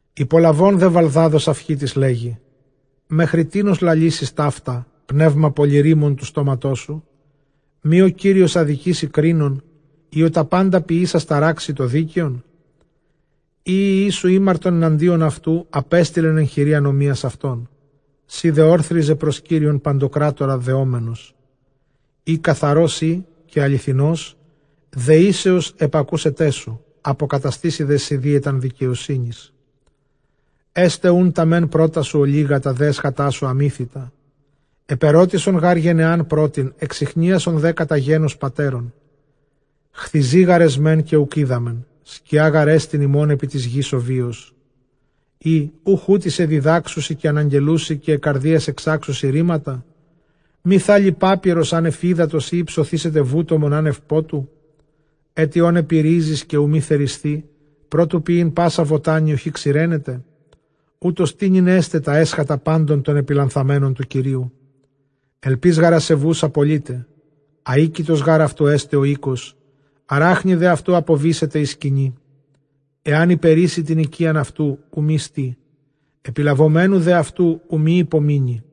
Ὑπολαβὼν δὲ Βαλδὰδ ὁ Σαυχίτης, λέγει, Μέχρι τίνος λαλήσεις ταῦτα, πνεῦμα πολυῤῥῆμον τοῦ στόματός σου; Μὴ ὁ Κύριος ἀδικήσει κρίνων; ἢ ὁ τὰ πάντα ποιήσας ταράξει τὸ δίκαιον; Εἰ οἱ υἱοί σου ἥμαρτον ἐναντίον αὐτοῦ, ἀπέστειλεν ἐν χειρὶ ἀνομίας αὐτῶν. Σὺ δὲ ὄρθριζε πρὸς Κύριον παντοκράτορα δεόμενος. Εἰ καθαρὸς εἶ καὶ ἀληθινὸς, δεήσεως ἐπακούσεταί σου, ἀποκαταστήσει δέ σοι δίαιταν δικαιοσύνης. Ἔσται οὖν τὰ μὲν πρῶτά σου ὀλίγα, τὰ δὲ ἔσχατά σου ἀμύθητα. Ἐπερώτησον γὰρ γενεὰν πρώτην, ἐξιχνίασον δὲ κατὰ γένος πατέρων· Χθιζοὶ γάρ ἐσμεν, καὶ οὐκ οἴδαμεν· σκιὰ γάρ ἐστιν ἡμῶν ἐπὶ τῆς γῆς ὁ βίος· Ἢ οὐχ οὗτοί σε διδάξουσιν καὶ ἀναγγελοῦσι, καὶ ἐκ καρδίας ἐξάξουσι ῥήματα; Μὴ θάλλει πάπυρος ἄνευ ὕδατος, ἢ ὑψωθήσεται βούτομον ἄνευ πότου; Ἔτι ὂν ἐπὶ ῥίζης, καὶ οὐ μὴ θερισθῇ, πρὸ τοῦ πιεῖν πᾶσα βοτάνη οὐχὶ ξηραίνεται; Οὕτως τοίνυν ἔσται τὰ ἔσχατα πάντων τῶν ἐπιλανθανομένων τοῦ Κυρίου· ἐλπὶς γὰρ ἀσεβοῦς ἀπολεῖται· Ἀοίκητος γὰρ αὐτοῦ ἔσται ὁ οἶκος· ἀράχνη δὲ αὐτοῦ ἀποβήσεται ἡ σκηνή. Ἐὰν ὑπερείσῃ τὴν οἰκίαν αὐτοῦ, οὐ μὴ στῇ· ἐπιλαβομένου δὲ αὐτοῦ, οὐ μὴ ὑπομείνῃ·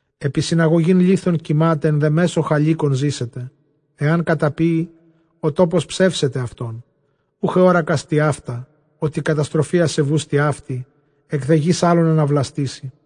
Ἐπὶ συναγωγὴν λίθων κοιμᾶται· ἐν δὲ μέσῳ χαλίκων ζήσεται. Ἐὰν καταπίῃ, ὁ τόπος ψεύσεται αὐτόν· οὐχ ἑώρακας τοιαῦτα, ὅτι καταστροφὴ ἀσεβοῦς τοιαύτη, ἐκ δὲ γῆς ἄλλον ἀναβλαστήσει.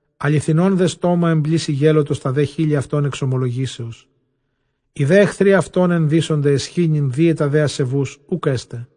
Ἀληθινῶν δὲ στόμα ἐμπλήσει γέλωτος, τὰ δὲ χείλη αὐτῶν ἐξομολογήσεως. Οἱ δὲ ἐχθροὶ αὐτῶν ἐνδύσονται αἰσχύνην, δίαιτα δὲ ἀσεβοῦς οὐκ ἔσται.